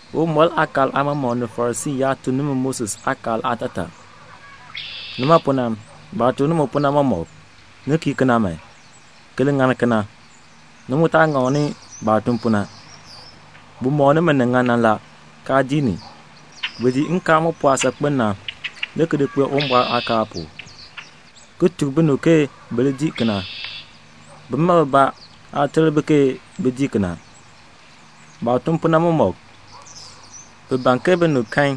"Uwumbɔr aakaal aamɔmɔkb ni Farisii yaab tuk nimi Moses aakaal aatataa. Nima pu na, baah tuk nimi pu na mɔmɔk, ni li kii kena man, ki li ŋani kena. Ni mu taa ŋakni baah tun pu na. Bi mɔk nimi ni ŋan na la, kaa dii ni. Bi di nkaal mu pɔɔ saakpen na, le ki di kpee Uwumbɔr aakaal pu, ki tuk binib ke bi li dii kena. Bima bibaa aa ter bi bin dii. Baah tun pu na mɔmɔk, bi ban ke binib kan,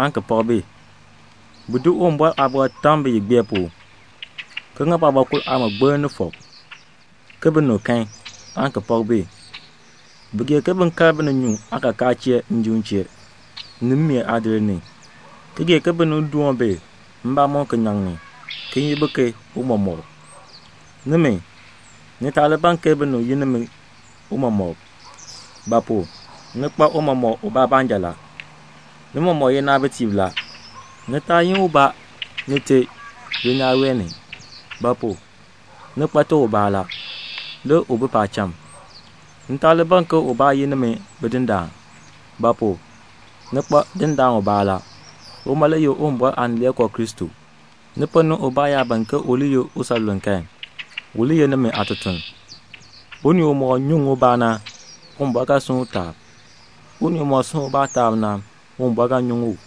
aan ki pak bi. Bi di Uwumbɔr aaliin ki di tam biyigbeer pu, ki ŋa baabɔkur aamɔgbiln ni fɔk, ke binib kan, aan ki pak bi. Bi gee ke bin kal bininyuun aakakaa chee njim chee, ni mmeen aadir ni, ki gee ke binib doon bi mbamɔm kinyaŋ ni, ki yin bi ke 'Tiicha.' Nimi, ni taa li ban ke binib yi nimi 'Tiicha;' ba pu? ni kpa Tiicha ubaa baanja la. Ni mɔmɔk ye naabitiib. Ni taa yi ubaa 'Nite' dulnyaa wee ni; ba pu? ni kpa te ubaa la, le u bi paacham. Ni taa li ban ke ubaa yi nimi 'Bidindaan'; ba pu? ni kpa dindaan ubaa la. Uma le ye Uwumbɔr Aanileekoo Kristo. Ni ponn ni ubaa yaa ban ke u li ye usanluln kan, u li ye nimi aatutuln. Unii umɔk nyuŋ ubaa na, Uwumbɔr ga sunn u taab. Unii umɔk sunn ubaa taab na, Uwumbɔr ga nyuŋ u."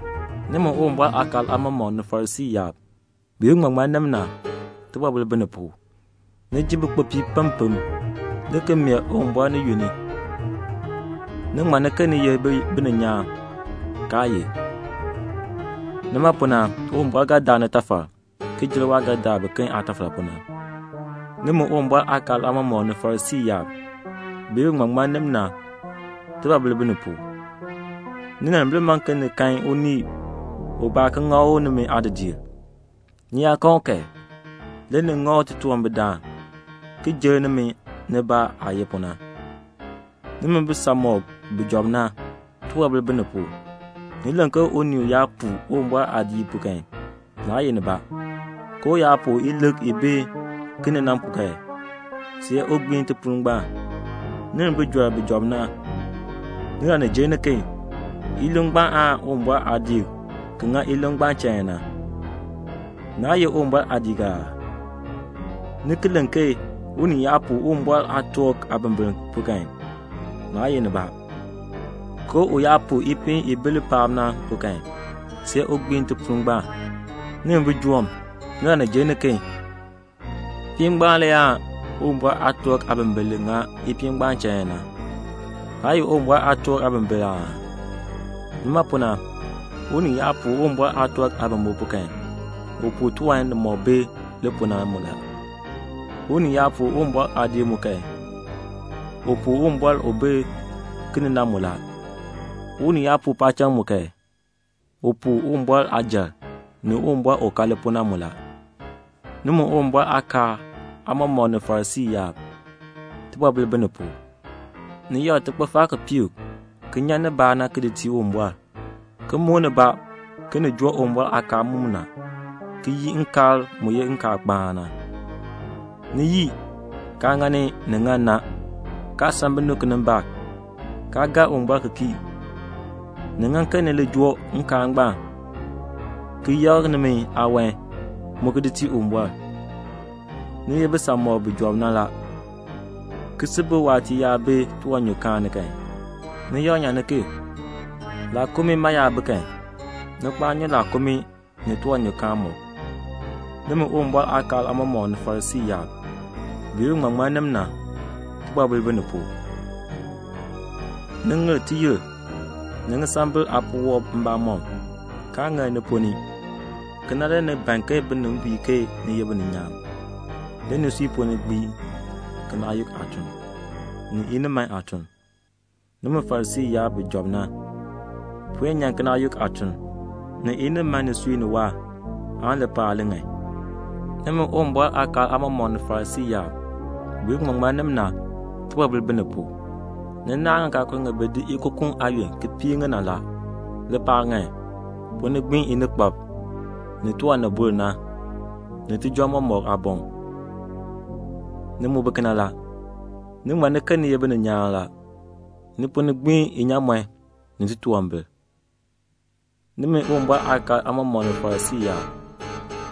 "Nimi Uwumbɔr aakaal aamɔmɔkb ni Farisii yaab, bi ye biŋmaŋmannim na, tibɔbil bi ni pu; ni jin bikpopiib pempem, le ki mee Uwumbɔr ni yunn, ni ti ŋmann ke ni ye bininyaan, kaa ye. Nima pu na Uwumbɔr ga daa nitafal ki jer waah ga daa biken aatafal pu na. "Nimi Uwumbɔr aakaal aamɔmɔkb ni Farisii yaab, bi ye biŋmaŋmannim na, tibɔbil bi ni pu; ninimbil man ke ni kan unii ubaa ki ŋa u nimi aadidiir. Ni yaa kan u kan, le ni ŋa u titunwambirdaan ki jer nimi nibaa aah ye pu na. "Nimi bisanmɔkb bi job na, tibɔbil bi ni pu; ni len ke 'Unii yaa puu Uwumbɔr aadiik kan, naa ye nibaa, ke u yaa puu ilik i bi ki ni kan, see u gbiin tipuul ngbaan.' Nimi bijɔrb bi job na, nilani jer niken, ilik ngbaan le aan Uwumbɔr aadiik ki ŋa ilik ngbaan chain na? Naa ye Uwumbɔr aadiik aa? Ni ki len ke 'Unii yaa puu Uwumbɔr aatork aabimbiln kan, naa ye nibaa, ke u yaa puu tiwankur ti bi li paak na, see u gbiin tipuul ngbaan.' Nimi bijoom, nilani jer niken, tiwankur ngbaan le aan Uwumbɔr aatork aabimbiln li ŋa tiwankur ngbaan chain na? Naa ye Uwumbɔr aatork aabimbiln aa? Nima pu na, unii yaa puu Uwumbɔr aatork aabimbiln kan, u puu tiwan nimɔk bi li pu na mu. Unii yaa puu Uwumbɔr aadiik kan, u puu Uwumbɔr u bi ki ni na mu. Unii yaa puu paacham kan, u puu Uwumbɔr aajal, ni Uwumbɔr u ka li pu na mu. "Nimi Uwumbɔr aakaal aamɔmɔkb ni Farisii yaab, tibɔbil bi ni pu; ni yakr tikpifar kipiik ki nyan nibaa na ki di tii Uwumbɔr, ki muk nibaa ke ni joo Uwumbɔr aakaal mumina, ki yii nkaal mu ye nkaalkpaan na. Ni yii, kaa ŋani ni ŋan na, kaa san binib kinimbaak, kaa gaa Uwumbɔr ki kii. Ni ŋan ke ni li joo nkaal ngbaan, ki yakr nimi aawan mu ki di tii Uwumbɔr. Ni ye bisanmɔkb bi job na la. Kisibirk waatiir yaa bi tiwanyukaan ni kan, ni yak nyan ki. Laakumii yaa bi kan, ni kpaan nyu laakumii ni tiwanyukaan mɔk. "Nimi Uwumbɔr aakaal aamɔmɔkb ni Farisii yaab, bi ye biŋmaŋmannim na, tibɔbil bi ni pu; ni ŋir tiyir ni ŋisambil aapuwɔb mbamɔm, kaa ŋir ni ponn ni. Kena le ni ban ke binib bui ke ni ye bininyaan. Le nisui ponn ni gbiin kinaayuk aatuln, ni iniman aatuln. Nimi Farisii yaab bi job na, puen nyan kinaayuk aatuln, ni iniman nisui ni waahr, aan lipaal yaan li ŋan. "Nimi Uwumbɔr aakaal aamɔmɔkb ni Farisii yaab, bi ye biŋmaŋmannim na, tibɔbil bi ni pu. Ni naahn ŋikaakul ŋi bi di ikukun aayon ki piir ŋi na. Lipaal ŋan. Ponn ni gbiin inikpab, ni nin bur na, ni tijɔŋ mɔk aaboŋ. Ni mu bi kena la. Ni ŋmann ke ni ye bininyaan la. Ni ponn ni gbiin inyaamɔn, ni titunwambir." "Nimi Uwumbɔr aakaal aamɔmɔkb ni Farisii yaab,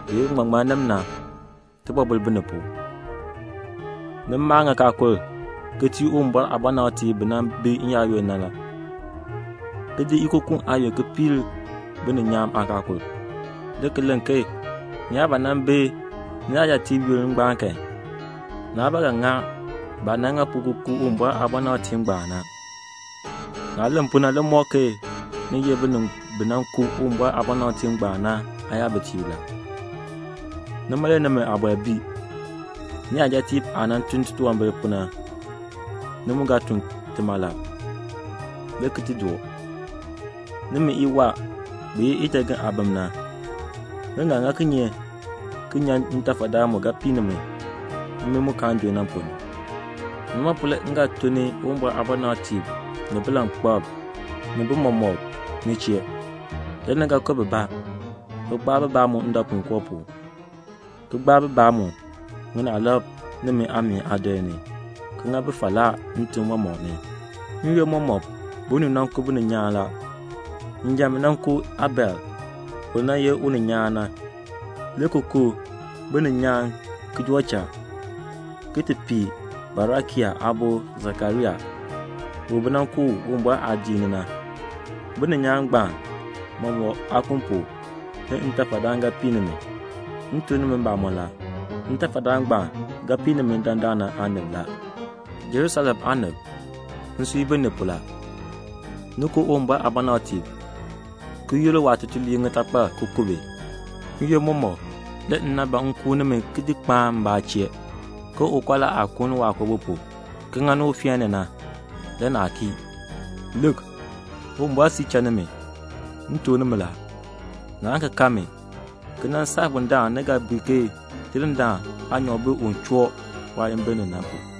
bi ye biŋmaŋmannim na, tibɔbil bi ni pu; ni maa ŋikaakul ki tii Uwumbɔr aabɔnabtiib bi nan bi n-yaayoonn na, ki di ikukun aayon ki piir bininyaan aakaakul, le ki len ke ni yaa ba nan bi niyajatiib yoonn ngbaan kan, naa ba ga ŋa baah nan ŋa pu ki ku Uwumbɔr aabɔnabtiib ngbaan na. Naah len pu na le mɔk ke ni ye binib bi nan ku Uwumbɔr aabɔnabtiib ngbaan na aayabitiib la. Nima le nimi aabɔr bii. Niyajatiib aah nan tun titunwambir na, ni mu ga tun tima la, le ki doo. Nimi iwaa, bi ye ijagen aabim na, ni ga ŋa kinye ki nyan ntafadaan mu ga pii nimi, mmii mu kaan junn na ponn ni. Nima pu na, le m ga tun Uwumbɔr aabɔnabtiib ni bilankpalb ni tiichatiib ni chee. Le ni ga ku bibaa, ki kpaa bibaa mu idɔpuinkoo pu, ki gbaa bibaa mu ŋinaalab nimi aameen aadir ni, ki ŋa bi falaa ntim mɔmɔk ni. N-yoonn mɔmɔk binib nan ku bininyaan la. Njan bi nan ku Abel u nan ye uninyaan na, le ki ku bininyaan ki joo cha, ki ti pii Barakia aabo Sakaria, u bi nan ku u Uwumbɔr aadiik ni na. Bininyaan ngbaan mɔmɔk aakun pu, le ntafadaan ga pii nimi. M tuk nimi mbamɔn la, ntafadaan ngbaan ga pii nimi dandana aanib la." "Jerusalem aanib, nsui bii ni pu la. Ni ku Uwumbɔr aabɔnabtiib, ki yur waatutuliib ŋitakpal ki ku bi. N-yoonn mɔmɔk le m nan ban m kuun nimi ki kpaan nimi m chee ke ukɔla aah kuuni waakoobi pu, ki ŋani ufeen ni na, le naa kii. Lik, Uwumbɔr siir cha nimi. M tuk nimi la, naan ki kan mi, ki nan saa bundaln ni ga bui ke 'Tidindaan aanyoor bi un choo waayimbil ni na pu."'